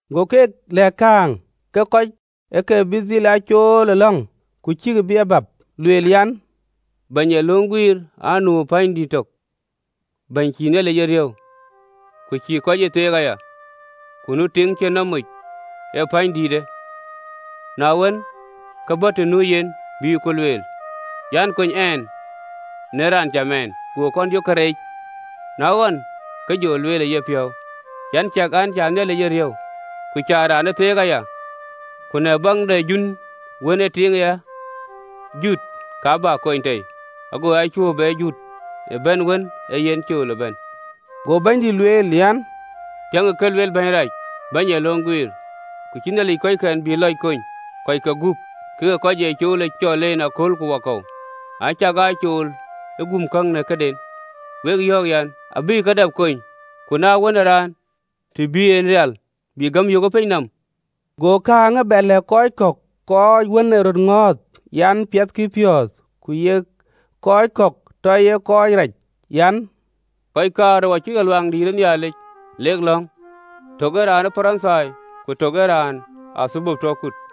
Go keek lɛ̈k kääŋ, ke kɔc ë ke bï dhil aa cool ë lɔ̈ŋ, ku cïkï ee bäp, lueel an, “Bɛ̈ny ee löŋ guiir anu pänydïït tök, bɛ̈ny cïï Nhialic ee riëëu, ku cïï kɔc ee theek aya. Ku nu tiiŋ cïn nɔm moc ë pänydïïtë, na wën, ke bɔ̈ të nu yen, ku lueel an, ‘Kony ɛn në raan cam ɛn!’ Go kɔn yök ke reec, na wën ke jɔ lueel ë yepiɔ̈u an, ‘Ciɛk an, cä Nhialic ee riëëu, ku cä raan ee theek aya, ku në baŋ de jun wën ee tiiŋë ya jut, ka bä kony tei, ago a cuö be jut në bɛ̈n wën ee yen cool ë bɛ̈n!”’ Go Bɛ̈nydït lueel an, “Piɛŋkï kë lueel bɛ̈ny rac, bɛ̈ny ee löŋ guiir. Ku cïï Nhialic kɔckɛn cï lɔc bï kony, kɔcke guöp, kek kɔc ee cool ë cɔl en akööl ku wakɔ̈u, acakaa yen ë cool ë gum käŋ në këden? Wek yɔ̈ɔ̈k an, abï ke dap kony. Ku na Wën ë Raan, të bï en rial, bï gäm yök ë piny nɔm?” Go kääŋë bɛ lɛ̈k kɔc kɔ̈k kɔc wën ee röt ŋɔ̈ɔ̈th, an, piɛthkï piɔ̈ɔ̈th, ku yek kɔc kɔ̈k tɔ ye kɔc rac an: “Kɔc kaarou acïk lɔ Luaŋdïït ë Nhialic, lek lɔ̈ŋ, tök ee raan ë Parithai, ku tök ee raan ë athölbö tɔ kut.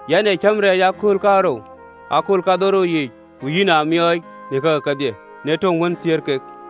Yɛn ee cäm rɛɛc ë akööl kaarou ë akööl kadhorou yiic, ku yïn aa miɔɔc në kakï kedhie në töŋ wën thiëër kek!’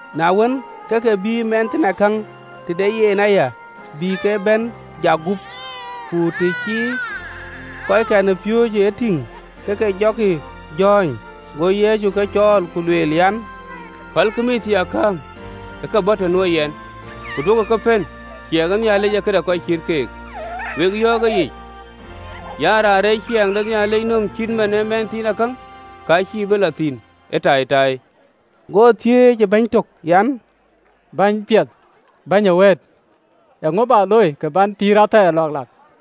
Na wën, ke ke bïï mïththiaakäŋ tëde yen aya bï ke bɛ̈n jak gup: ku të cï kɔckɛn ë piööcë e tïŋ, ke ke jɔkï jɔ̈ɔ̈ny. Go Yecu ke cɔɔl, ku lueel an, “Pälkï mïththiaakäŋ ë ke bɔ̈ të nuö yɛn, ku duökï ke pën: ciɛɛŋ de Nhialic ee këde kɔc cït keek. Wek yɔ̈ɔ̈k ëyic an, Raan reec ciɛɛŋ de Nhialic nööm cït man ë mɛnhthiinakäŋ, ka cïï bï lɔ thïn ë taitai.” Go thiëëc ë bɛ̈ny tök an, “Bɛ̈ny piɛth bɛ̈ny ee wëët, eeŋö bä looi kë bän pïïr athɛɛr lɔ̈ɔ̈k lak?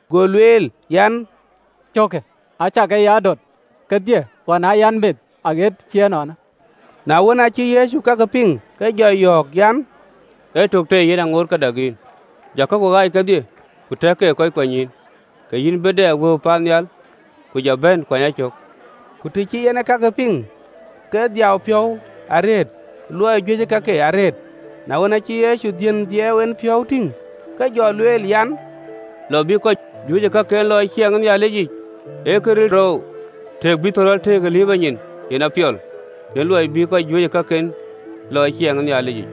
Go lueel an, “Cökkë acä ke ya döt kedhie ɣɔn aa yɛn meth aɣet cï ënɔɔnë.”’ Na wën, aacï Yecu kakë piŋ, ke jɔ yɔ̈ɔ̈k an, “Ee tök tei yen ŋoot ke dak yïn. Jɔ kaku ɣaac kedhie, ku tɛ̈kë ke kɔc kuanynyïïn, ke yïn bï dɛ wëu paannhial: ku jɔ bɛ̈n, kuany a cök.” Ku të cï en ee kakë piŋ, ke dhiau piɔ̈u arëët: luɔi juëcë kakë arëët. Na wën, aacï Yecu dhiën dhiɛɛu en piɔ̈u tïŋ, ke jɔ lueel an, “Lɔ bï kɔc juëc ë kaken lɔ ë ciɛɛŋ de Nhialic, ee këril oou! Tëëk bï thɔ̈rɔ̈l tëëk ë liiprɔ nyin, yen ee këpiɔl, në luɔi bï raan juëc ë kakë lɔ ë ciɛɛŋ de Nhialic yic.”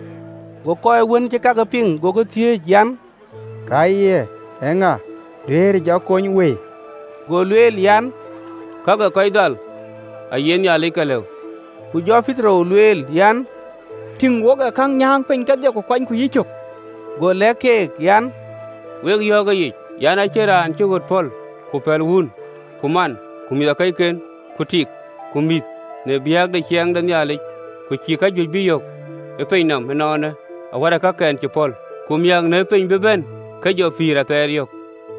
Go kɔc wën cïï kakë piŋ gokï thiëëc an, “Ka ye ŋa duëërë jɔ kony wëi?” Go lueel an, “Kak ë kɔc dhal aye Nhialic ke lëu.” Ku jɔ Petero lueel an, “Tïŋ, wo ë käŋ nyääŋ piny kedhie, ku kuanyku yïcök.” Go lɛ̈k keek an, “Wek yɔ̈ɔ̈k ëyic an, acïn raan cï ɣöt pɔ̈l, ku pɛ̈l wun ku man, ku mïthëkɔcken, ku tik, ku mïth në biäk de ciɛɛŋ de Nhialic, ku cïï kajuëc bï yök ee pinyë nɔm ënɔɔnë, awärkï kakɛn cï pɔ̈l, ku miäk në piny bï bɛ̈n, ke jɔ pïïr athɛɛr yök.”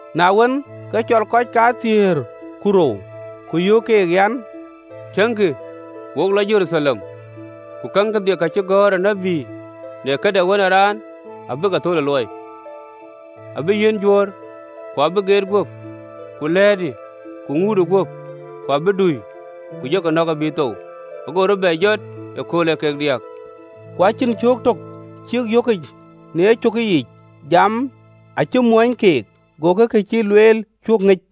Na wën, ke cɔl kɔcke kathiëër ku rou, ku yöök keek an, “Tiëŋkï! Wo lɔ Jeruthalem, ku käŋ kedhie ka cï gɔ̈ɔ̈r ë tït në këde Wën ë Raan abï ke thöl ë luɔi. Abï yiɛ̈n Juöör, ku abï geet guöp, ku lɛ̈ɛ̈të, ku ŋuutë guöp. Ku abïk dui, ku jɔkï nɔ̈k abï thou, ku abï rɔt bɛ jɔt ëkööl ee kek diäk.” Ku acïn cöök töŋ cïk yökic në kakë yiic: jamë acï mɔ̈ny keek, agokï ka cï lueel, cuö ŋic.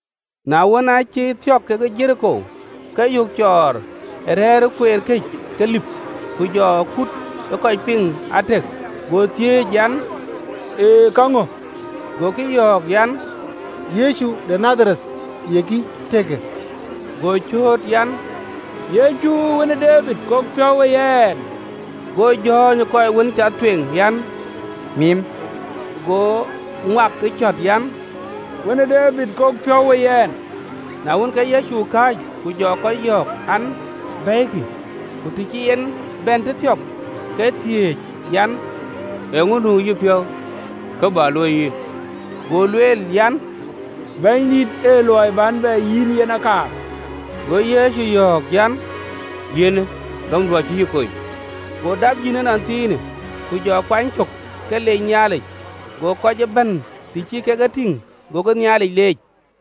Na wën, aacï thiɔ̈k ke Jeriko, ke yök cɔɔr a rɛ̈ɛ̈r ë kueer këc ke lip. Ku jɔ kut ë kɔc piŋ atëk, go thiëc an, “Ee käŋö?” Gokï yɔ̈ɔ̈k an, “Yecu de Nadhareth yekï tëkë.” Go cööt an, “Yecu Wën ë Debid, kok piɔ̈u we yɛn!” Go jɔ̈ɔ̈ny ë kɔc wën cath tueŋ an, mim. Go ŋuak ë cɔ̈t an, “Wën ë Debid, kok piɔ̈u we yɛn!” Na wën, ke Yecu kääc, ku jɔ kɔc yɔ̈ɔ̈k an, bɛ̈ɛ̈ikï. Ku të cï en bɛ̈n tëthiɔ̈k, ke thiëëc an: “Eeŋö nu ë yïpiɔ̈u, kë bä luöi yïn?” Go lueel an, “Bɛ̈nydït, ee luɔi bän bɛ yïn yen akaar.” Go Yecu yɔ̈ɔ̈k an, “Yiɛ̈në! Gämdu acï yï kony.” Go dap yïn ënɔnthiinë, ku jɔ kuany cök, ke lec Nhialic: go kɔc ëbɛ̈n, të cï kek e tïŋ, gokï Nhialic leec.